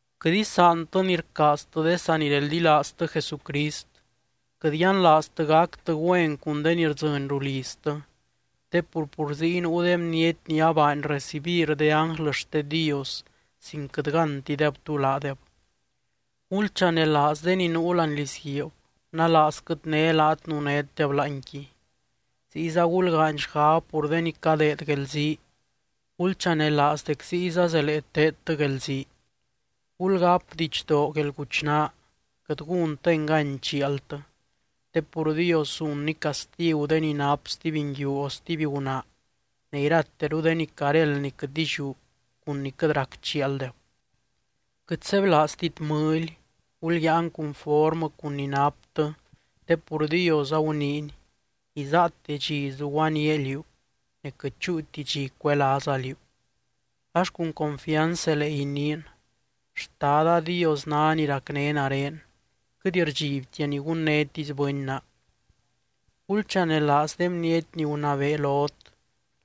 Quɨt isaantɨ ni rcaaztɨ de sanireldilaaztɨ Jesucrist. Quɨt yianlaaztɨ gactɨ güen cun de ni rdzɨny ruliztɨ, te pur, pur ziy nuu de bniety ni abaany recibir de ánglɨ xte Dios sin quɨt gántideb tú laadeb. Gulchanelaaz de ni nuu láani lizguiib, nalaazquɨt né laat nunétdeb láanqui. Ziyza gulgaany xgab pur de ni cadeed guelzii, gulchanelaaz dec ziyza zelee teedtɨ guelzii. Gulgáp didxdoo guelguchnaa, quɨt gúntɨ engany chialtɨ. Te pur Dios zunny castigu de ni nap stuby nguiu o stuby gunaa, ne irateru de ni caréld ni quɨt illiú cun ni quɨt rac chialdeb. Quɨt sebylaaztit mɨly, gulyáan cunformɨ cun ni naptɨ te pur Dios aguniiny: “Isaate dxi zuguaníaa liú, ne quɨt chúuti dxi cuelaaza liú.” Ax cun confianz zelee iniin: Xtada Dios ná ni racné nare, quɨt rdxibtia ni gunnétisy bɨny naa. Gulchanelaaz de bniety ni gunabee lot,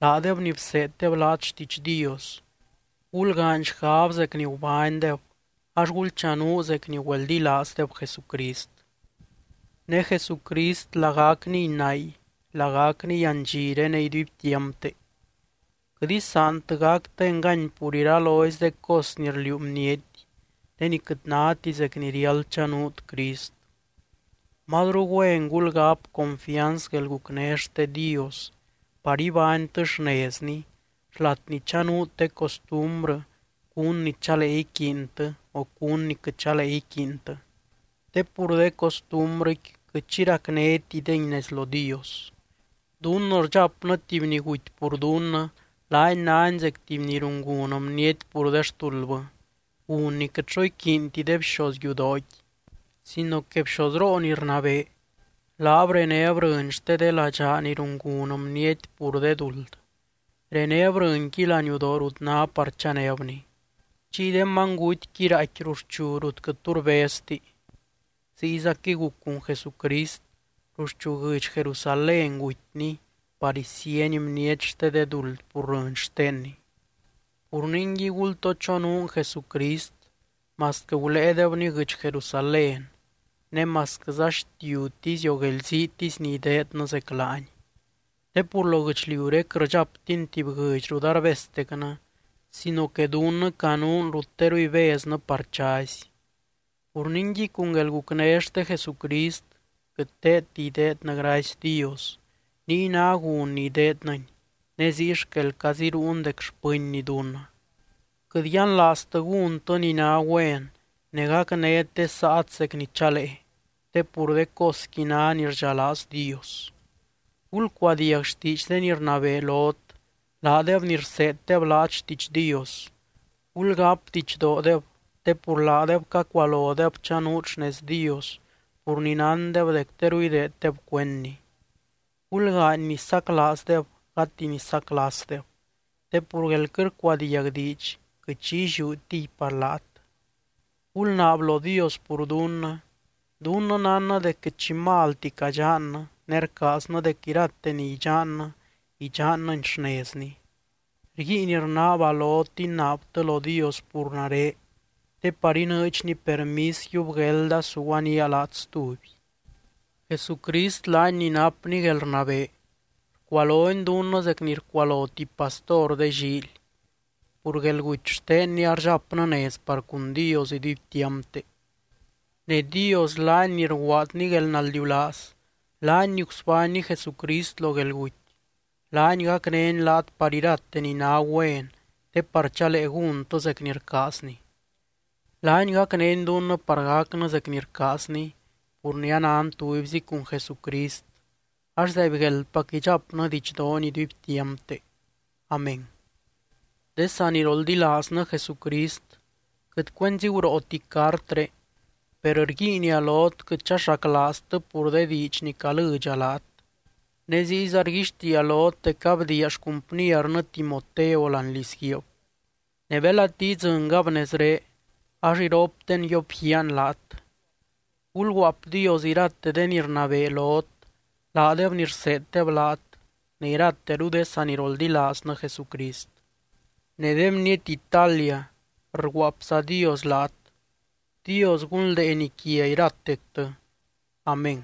laadeb ni bseeddeb laat xtiidx Dios. Gulgaany xgab zec ni gubánydeb, ax gulchanuu zec ni güeldilaazdeb Jesucrist. Ne Jesucrist lagacniy nay, lagacniy andxiré ne iduibtiampte. Quɨt isaantɨ gactɨ engany pur iralozy de cos ni rliuu bniety, de ni quɨt náti zec ni riáld chanuut Crist. Mazru güen gulgáp confianz guelgucné xte Dios par ibánytɨ xnezni xlat ni chanuut de costumbrɨ cún ni chalee iquiintɨ o cún ni quɨt chalee iquiintɨ, te pur de costumbrɨqui quɨt xi racnétidey nez lo Dios. Dunnɨ rdxapnɨ tuby ni guty pur dunnɨ, laany nány zec tuby ni rungun bniety pur de xtuldbɨ, gun ni quɨt xo iquiinti de bxoz yudooqui. Sino que bxozroo ni rnabee, laab renéb rɨny xte de ladxaa ni rungun bniety pur de duld, renéb rɨnqui laniudoo rut ná par chanébni. Chiy de manygutyqui raaicqui ruxchu rut quɨt tu rbezti. Ziyzaquɨy guc cun Jesucrist, ruxchu guɨdx Jerusalén gutyny par isíeny bniety xte de duld pur rɨny xtenny. Pur ningui, gultoo chonuun Jesucrist masquɨ guléedebny guɨdx Jerusalén, ne masquɨza xtiutisy o guelziitisy ni ideednɨ zec laany. Te pur lo guɨchliuré quɨt rdxaptin tuby guɨdx rut arbeztecnɨ sino que dunnɨ canuun rut teru ibeznɨ par chazy. Pur ningui, cun guelgucné xte Jesucrist quɨt teedti ideednɨ gracy Dios, niy ná gun ni ideednɨny, ne ziy xquel caziruun dec xpɨnny dunnɨ. Quɨt yianlaaztɨ gúntɨ ni ná güen ne gacnét de saat zec ni chalee, te pur de cosqui ná ni rdxalaaz Dios. Gulcuadiag xtiidx de ni rnabee lot, laadeb ni rseeddeb laat xtiidx Dios. Gulgáp didxdoodeb te pur laadeb cacualodeb chanuut xnez Dios, pur ni nándeb dec teru ideeddeb cuendny. Gulgaany ni saclaazdeb gati ni saclasdeb, te pur guél quɨt rcuadiag diidx quɨt xi illiútiy par laat. Gulnaab lo Dios pur dunnɨ. Dunnɨ nánnɨ dec quɨt xi malti cadxannɨ, ne rcaaznɨ dec irate ni idxannɨ, idxannɨni xnezni. Rguiin rnaaba lot inaabtɨ lo Dios pur nare, te par inɨɨdxny permis yiub guelda suguanía laat stuby. Jesucrist laany ni napny guelrnabee, rcualony dunnɨ zec ni rcualo tuby pastor de llíily, pur guelguty xtenny ardxapnɨ nez par cun Dios iduibtiampte. Ne Dios laany ni rguaadny guelnaldiulaaz, laany ni gusbánny Jesucrist lo guelguty, laany gacnény laat par irate ni ná güen te par chalee gúntɨ zec ni rcaazny. Laany gacnény dunnɨ par gacnɨ zec ni rcaazny pur ni anan tubyzi cun Jesucrist ax, ¡zaibgueldpac idxapnɨ didxdoony iduibtiampte! Amén. De saniroldilaaznɨ Jesucrist, quɨt cuenzi gurooti cartré, per rguiinia lot quɨt chaxaclaaztɨ pur de diidx ni calɨdxa laat. Ne ziyza rguixtiia lot dec abdiia xcumpniernɨ Timoteo láani lizguiib, ne belati idzɨngab nezré, ax iropten yiopguiaan laat. Gulguaapdios irate de ni rnabee lot laadeb ni rseeddeb laat, ne irateru de saniroldilaaznɨ Jesucrist. Ne de bniety Italia rguaapzadios laat. Dios gunldeeny quia iratectɨ. Amén.